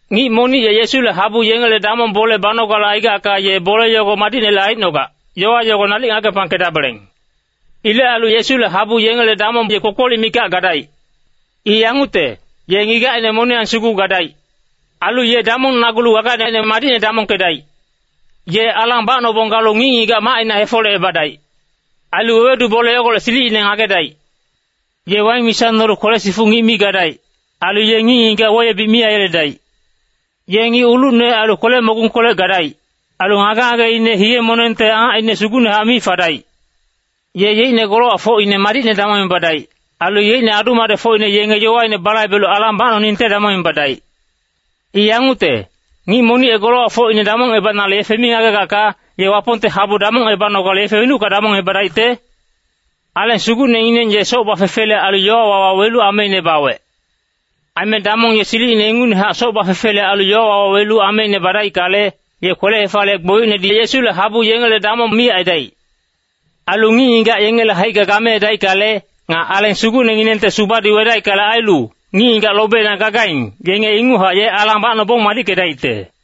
Ngic monic ye Yesule habu yengele damong bole banogale aigacka ye bole yogo madicnele aicnogac, yowa yogo nalic ngagepangkedabeleng. Ilec ailu Yesule habu yengele damong ye kpokpolic mikac gadaic. I yangucte, ye ngigacine moniyang sugu gadaic. Ailu ye damongnagulu gagaine madicne damongkedaic. Ye alang bacnobong galu ngic-ngigac macina hefolecebadaic. Ailu wewedu bole yogolec silicine ngagedaic. Ye waing misa nolu kwele-sifuc ngic mi gadaic. Ailu ye ngic-ngigac weyebic mi aiyeledaic. Ye ngic ulucne ailu kwele-mogungkolec gadaic. Ailu ngage-ngageine hiye-monengte angacine sugucnehac mi fadaic. Ye yeicne golowacfocine madicne damongebadaic. Ailu yeicne adu-madecfocine yenge yowaine balaibelu alang bacnoningte damongebadaic. I yangucte, ngic monic ye golowacfocine damongebanale yefe mi ngagegacka, ye Wapongte habu damongebanogale yefe wenucka damongebadaicte? Aleng Sugucnengineng ye soc bafefele ailu yowawa wawelu ameine bawec. Aime damong ye silicine ingucnehac soc bafefele ailu yowawa wawelu ameine badaickale, ye kwele-hefaliyec gbolicnedi Yesule habu yengele damong mi aidaic. Ailu ngic-ngigac yengele haicka gameedaickale, nga Aleng Sugucnenginengte subadi wedaickale ailu, ngic-ngigac lobeina gagaing, yenge inguchac ye alang bacnobong madickedaicte.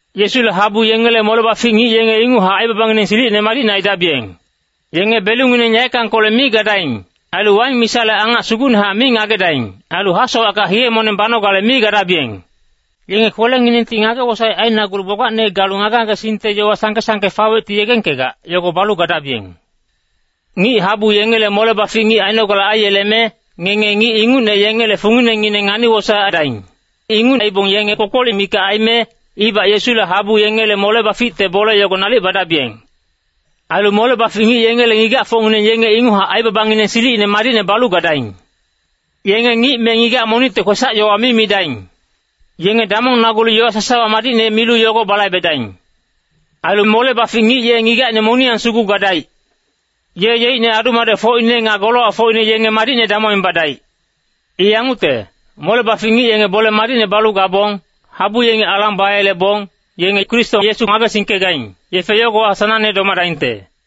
Yesule habu yengele mole-bafic ngic yenge inguchac aibabangineng silicine madicne aidabiyeng. Yenge belungineng yaeckangkolec mi gadaing. Ailu waing misale angac sugucnehac mi ngagedaing. Ailu hasowacka hiye-moneng banogale mi gadabiyeng. Yenge kwelenginengti ngage-wosaec ainagulu gbagbacne galu ngage-ngagesingte yowa sangke-sangke fawecti yegengkegac, yogo balu gadabiyeng. Ngic habu yengele mole-bafic ngic ainogale aiyeleme, ngenge ngic ingucne yengele funginengineng ngani-wosaec aidaing. Inguc aibong yenge kpokpolic mikac aime, ibac Yesule habu yengele mole-baficte bole yogo nalic badabiyeng. Ailu mole-bafic ngic yengele ngigacfocngineng yenge inguchac aibabangineng silicine madicne balu gadaing. Yenge ngic me ngigac monicte kwesac-yowa mi midaing. Yenge damongnagulu yowa sasawa madicne milu yogo balaibedaing. Ailu mole-bafic ngic ye ngigacine moniyang sugu gadaic. Ye yeicne adu-madecfocine nga golowacfocine yenge madicne damongebadaic. I yangucte, mole-bafic ngic yenge bole madicne balu gabong, habu yengi alang bayelebong, yenge Kristo Yesu ngagesingkegaing, yefe yogowa sanangne domadaingte.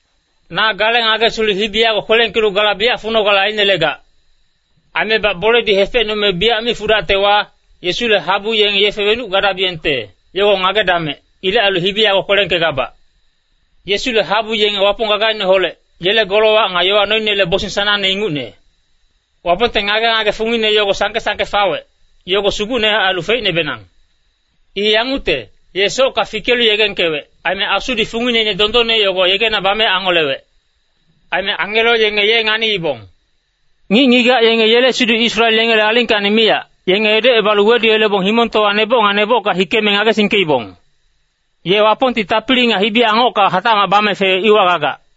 Na gale ngagesilu hibi yago kwelengkelu gala biyac funogale ainelegac. Aimebac boledi hefecnume biyac mi fudactewa, Yesule habu yenge yefe wenuc gadabiyengte, yogo ngagedamec. Ilec ailu hibi yago kwelengkegabac. Yesule habu yenge Wapong gagaineholec, yele golowac nga yowa noinele bosing sanangne ingucne. Wapongte ngage-ngage fungine yogo sangke-sangke fawec, yogo sugucnehac ailu feicnebenang. I yangucte, Ye socka fikelu yegengkewec. Aime Asudi fungineine dondonne yogo yegena bame angolewec. Aime angelo yenge ye nganiibong. Ngic-ngigac yenge yele siduc Israel yengele alingkacni miyac, yenge edocebalu weduyelebong Himongtowa neboc nga nebocka hikeme ngagesingkeibong. Ye Wapongti tapili nga hibi-angocka hatacmac bame fewec iwa gagac.